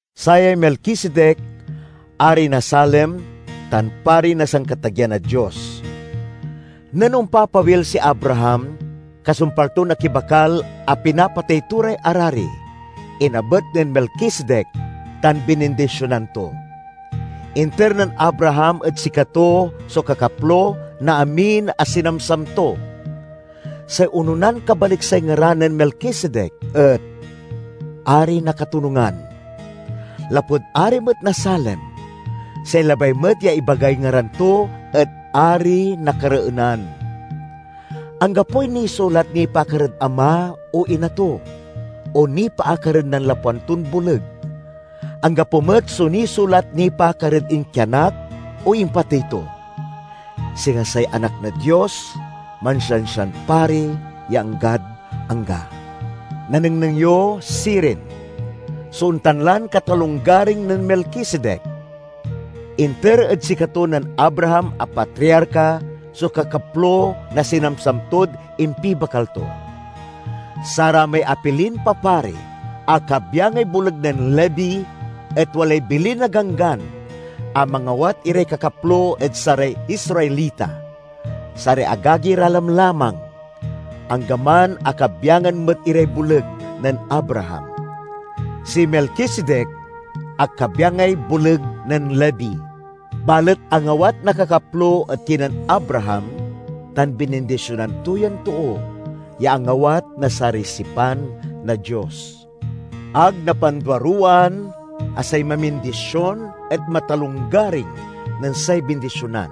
Sayay Melkisedek ari na Salem tan pari na Sankatageyan a Dios. Nen ompapawil si Abraham, kasumpal ton akibakal a pinapatey to ray arari, inabet nen Melkisedek tan binindisionan to. Inter nen Abraham ed sikato so kakaplo na amin a sinamsam to. (Say ononan kabaliksay ngaran nen Melkisedek et "Ari na Katonungan." Lapud ari met na Salem, say labay met ya ibagay ngaran to et "Ari na Kareenan.") Anggapoy nisulat nipaakar ed ama o ina to, o nipaakar ed nanlapwan ton boleg. Anggapo met so nisulat nipaakar ed inkianak o impatey to. Singa say Anak na Dios, mansiansian pari ya anggad angga. Nanengneng yo, sirin, so ontan lan katalonggaring nen Melkisedek! Inter ed sikato nen Abraham a patriarka so kakaplo na sinamsam tod impibakal to. Saramay apilin papari a kabyangay boleg nen Levi et walay bilin na Ganggan a mangawat iray kakaplo ed saray Israelita, saray agagi ra lamlamang, anggaman a kabyangan met iray boleg nen Abraham. Si Melkisedek ag kabyangay boleg nen Levi, balet angawat na kakaplo ed kinen Abraham tan binindisionan to yan too ya angawat na saray sipan na Dios. Ag napanduaruwaan a say mamindision et matalonggaring nen say bindisionan.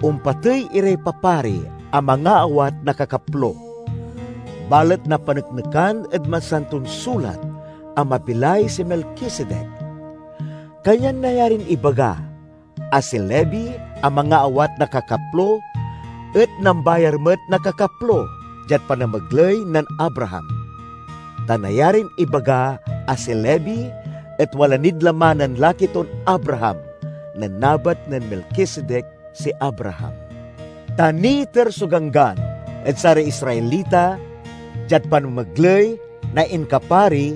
Ompatey iray papari a mangaawat na kakaplo, balet napaneknekan ed Masanton Sulat a mabilay si Melkisedek. Kanyan nayarin ibaga a si Levi a mangaawat na kakaplo et nambayar met na kakaplo diad panamegley nen Abraham. Ta nayarin ibaga a si Levi et wala nid laman nen laki ton Abraham, nen nabet nen Melkisedek si Abraham. Ta niiter so Ganggan ed saray Israelita diad panamegley na inkapari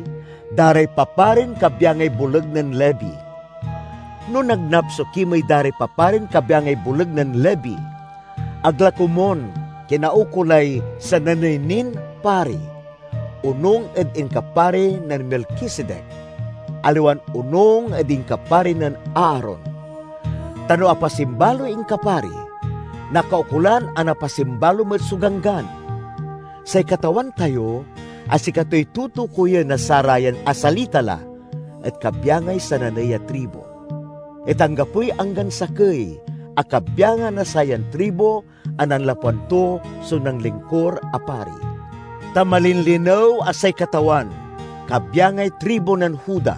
da ray paparin kabyangay boleg nen Levi. No nagnap so kimey da ray paparin kabyangay boleg nen Levi, ag la komun kinaukolay sananey nin pari onung ed inkapari nen Melkisedek, aliwan onung ed inkapari nen Aaron. Ta no apasimbaloy inkapari, nakaukolan a napasimbalo met so ganggan. Say Katawan tayo, a sikatoy tutukoyen na sarayan asalita la, et kabyangay sananey a tribu; et anggapoy anggan sakey a kabyangan na sayan tribu a nanlapwan to so nanlingkur a pari. Ta malinlinew a say Katawan kabyangay tribu nen Juda;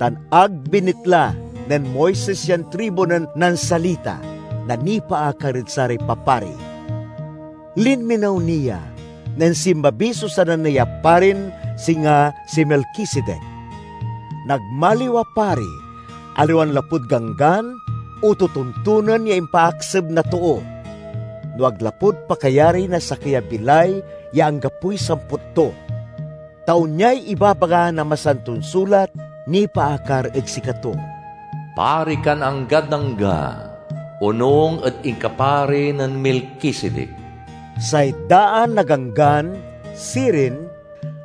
tan ag binitla nen Moises yan tribu nen nansalita na nipaakar ed saray papari. Linminew ni ya nen sinmabi so sananey a parin singa si Melkisedek. Nagmaliw a pari, aliwan lapud ganggan o totontonen ya impaakseb na too, no ag lapud pakayari na sakey a bilay ya anggapoy samput to. Ta onyay ibabaga na Masanton Sulat nipaakar ed sikato: "Pari kan anggad angga, onung ed inkapari nen Melkisedek." Say daan a ganggan, sirin,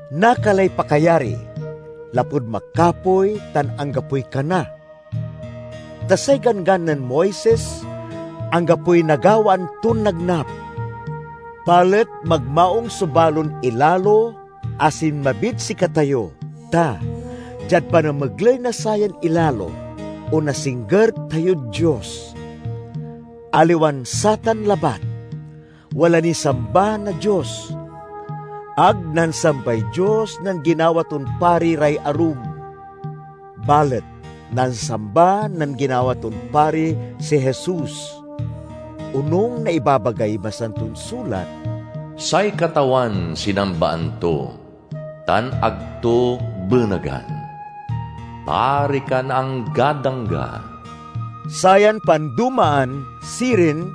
nakalay pakayari lapud makapoy tan anggapoy kana. Ta say Ganggan nen Moises anggapoy nagawaan ton nagnap. Balet magmaung so balon ilalo a sinmabid sikatayo ta, diad panamegley na sayan ilalo, onasingger tayod Dios. Aliwan satan labat, wala niy samba na Dios. Ag nansambay Dios nen ginawa ton pari ray arum, balet nansamba nen ginawa ton pari si Jesus. Onung na ibabagay Masanton Sulat, "Say Katawan sinambaan to tan ag to benegan: 'Pari kan anggad angga.'" Sayan pandomaan, sirin,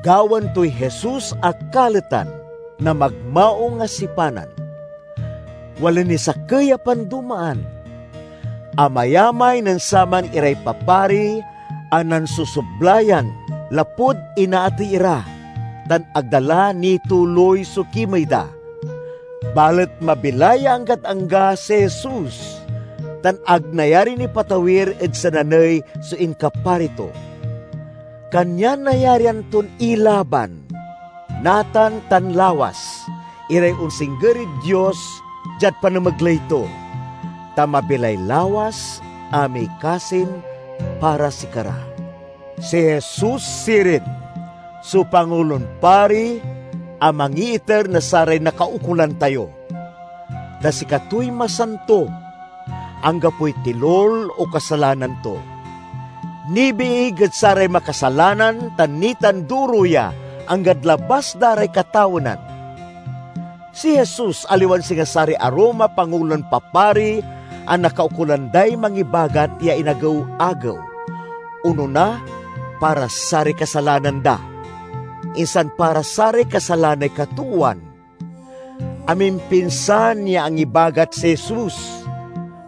gawaen toy Jesus a kaletan na magmaung a sipanan. Wala niy sakey a pandomaan: amayamay nen saman iray papari a nansosoblayan lapud inaatey ira tan ag da la nituloy so kimey da. Balet mabilay ya anggad angga si Jesus, tan ag nayarin ipatawir ed sananey so inkapari to. Kanyan nayarian ton ilaban, natan tan lawas, iray onsingger ed Dios diad panamegley to, ta mabilay lawas a mikasin para sikara. Si Jesus sirin, so Pangulon Pari a mangiiter na saray nakaukolan tayo! Ta sikatoy masanto; anggapoy tilul o kasalanan to; nibiig ed saray makasalanan tan nitanduro ya anggad labas da ray katawenan. Si Jesus aliwan singa saray arum a pangulon papari a nakaukolan day mangibagat ya inagew-agew, onona para saray kasalanan da, insan para saray kasalanay katoowan. Amimpinsan ya angibagat si Jesus,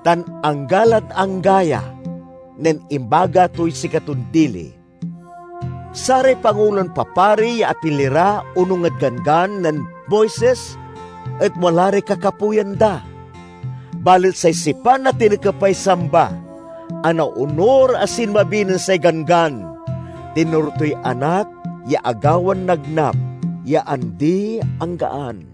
tan angga lad angga ya, nen imbagat toy sikaton dili. Saray pangulon papari ya apili ra onung ed Ganggan nen Moises et wala ray kakapoyan da; balet say sipan a tinekepay samba, a naonur a sinmabi nen say Ganggan, tinoro toy Anak ya agawan nagnap ya andi-anggaan.